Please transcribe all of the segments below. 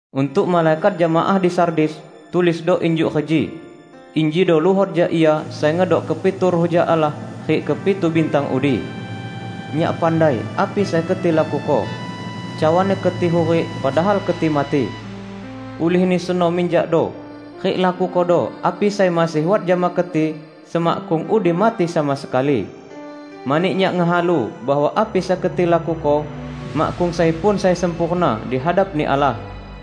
"Untuk malaikat jemaah di Sardis, tulisdo injuk reji: Injido luhot jak Ia sai ngedok kepitu ruh jak Allah rik kepitu bintang udi. Nyak pandai api sai keti lakuko. Cawani keti hurik, padahal keti mati! Ulihni seno minjakdo, rik lakukodo api sai masih wat jama keti semakkung udi mati sama sekali. Mani Nyak ngehalu bahwa api sai keti lakuko, makkung sai pun sai sempurna di hadap-Ni Allah.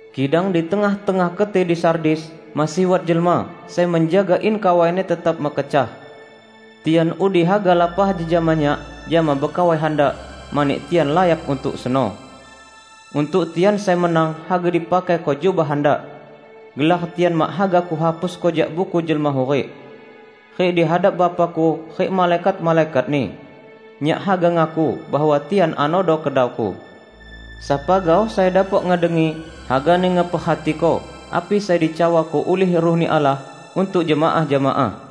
Kidang di tengah-tengah keti di Sardis masih wat jelma sai menjaga in kawaini tetap mekecah. Tian udi haga lapah jejama Nyak jama bekawai handak, mani tian layak untuk seno. Untuk tian sai menang haga dipakaiko jubah handak. Gelar tian mak haga Kuhapusko jak Buku Jelma Hurik. Rik di hadap Bapa-Ku rik malaikat-malaikat-Ni. Nyak haga ngaku bahwa tian anodo kedau-Ku. Sapa gaoh sai dapok ngedengi, hagani ngeperhatiko api sai dicawako ulih Ruh-Ni Allah untuk jemaah-jemaah!"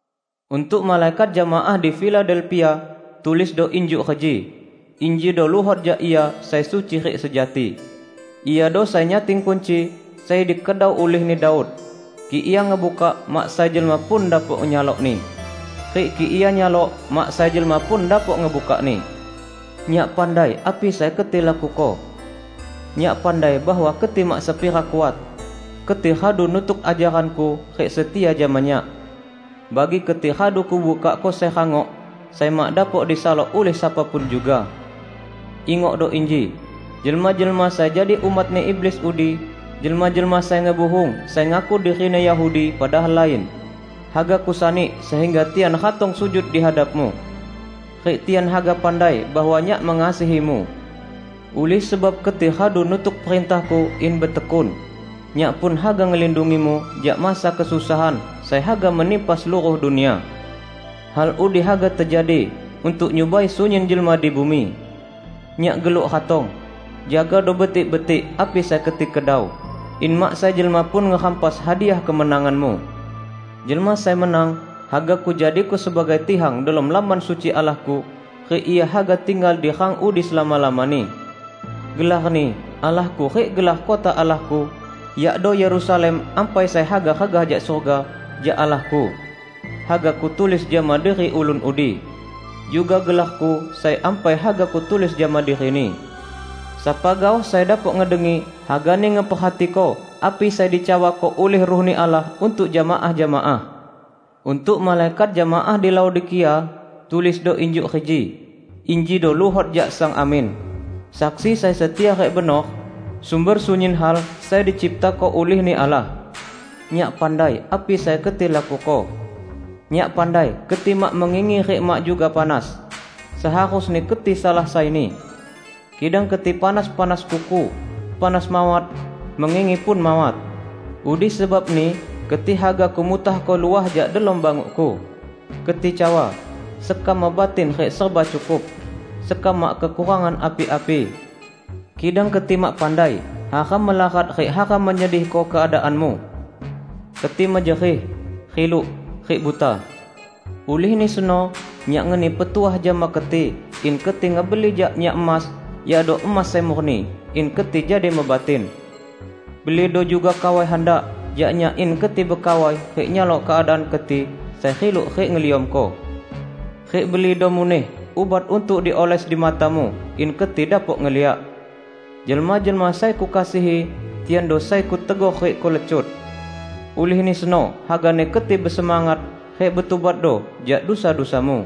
"Untuk malaikat jemaah di Filadelpia, tulisdo injuk reji: Injido luhot jak Ia sai suci rik sejati. Iado sai nyating kunci sai dikedau ulihni Daud; kik Ia ngebukak, mak sai jelma pun dapok nyalokni, rik kik Ia nyalok, mak sai jelma pun dapok ngebukakni. Nyak pandai api sai keti lakuko. Nyak pandai bahwa keti mak sepira kuat; keti radu nutuk ajaran-Ku rik setia jama Nyak. Bagi keti radu Kubukakko sai rangok, sai mak dapok disalok ulih sapa pun juga. Ingokdo inji: Jelma-jelma sai jadi umatni iblis udi, jelma-jelma sai ngebuhung sai ngaku dirini Yahudi padahal lain, haga Kusani sehingga tian ratong sujud di hadapmu. Rik tian haga pandai bahwa Nyak mengasihimu. Ulih sebab keti radu nutuk perintah-Ku in betekun, Nyak pun haga ngelindungimu jak masa kesusahan sai haga menimpa seluruh dunia. Hal udi haga tejadi untuk nyubai sunyin jelma di bumi. Nyak geluk ratong! Jagado betik-betik api sai keti kedau, in mak sai jelma pun ngerampas hadiah kemenanganmu. Jelma sai menang, haga Kujadiko sebagai tihang delom Lamban Suci Allah-Ku, rik ia haga tinggal di rang udi selama-lamani. Gelar-Ni Allah-Ku rik gelar kota Allah-Ku -- yakdo Yerusalem ampai sai haga regah jak surga, jak Allah-Ku -- haga Kutulis jama diri ulun udi. Juga gelar-Ku sai ampai haga Kutulis jama dirini. Sapa gaoh sai dapok ngedengi, hagani ngeperhatiko api sai dicawako ulih Ruh-Ni Allah untuk jemaah-jemaah!" "Untuk malaikat jemaah di Laodikia, tulisdo injuk reji: Injido luhot jak Sang Amin, Saksi sai setia rik benor, sumber sunyin hal sai diciptako ulih-Ni Allah. Nyak pandai api sai keti lakuko; Nyak pandai keti mak mengingi rik mak juga panas. Seharusni keti salah saini! Kidang keti panas-panas kuku; panas mawat, mengingi pun mawat. Udi sebabni keti haga Kumutahko luah jak delom banguk-Ku. Keti cawa, 'Sekam mebatin rik serba cukup; sekam mak kekurangan api-api.' Kidang keti mak pandai hara melarat rik hara menyedihko keadaanmu! Keti mejerih, riluk, rik buta. Ulihni seno Nyak ngeni petuah jama keti in keti ngebeli jak Nyak emas, yakdo emas sai murni, in keti jadi mebatin. Belido juga kawai handak jak Nyak in keti bekawai rik nyalok keadaan keti sai riluk rik ngeliamko. Rik belido muneh ubat untuk dioles di matamu in keti dapok ngeliak. Jelma-jelma sai Kukasihi, tiando sai Kutegor rik Kulecut. Ulihni seno hagani keti besemangat, rik betubatdo jak dusa-dusamu.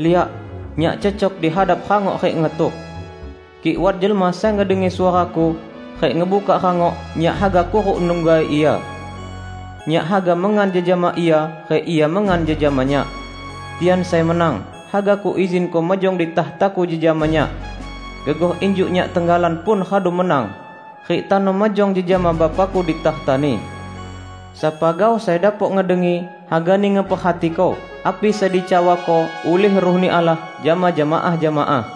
Liak! Nyak cecok di hadap rangok rik ngetuk. Kik wat jelma sai ngedengi suara-Ku, rik ngebukak rangok, Nyak haga kuruk nungga ia; Nyak haga mengan jejama ia rik ia mengan jejama Nyak. Tian sai menang, haga Kuizinko mejong di takhta-Ku jejama Nyak, gegoh injuk Nyak tenggalan pun radu menang rik tano mejong jejama Bapa-Ku di takhta-Ni. Sapa gaoh sai dapok ngedengi, hagani ngeperhatiko api sai dicawako ulih Ruh-Ni Allah jama jemaah-jemaah!"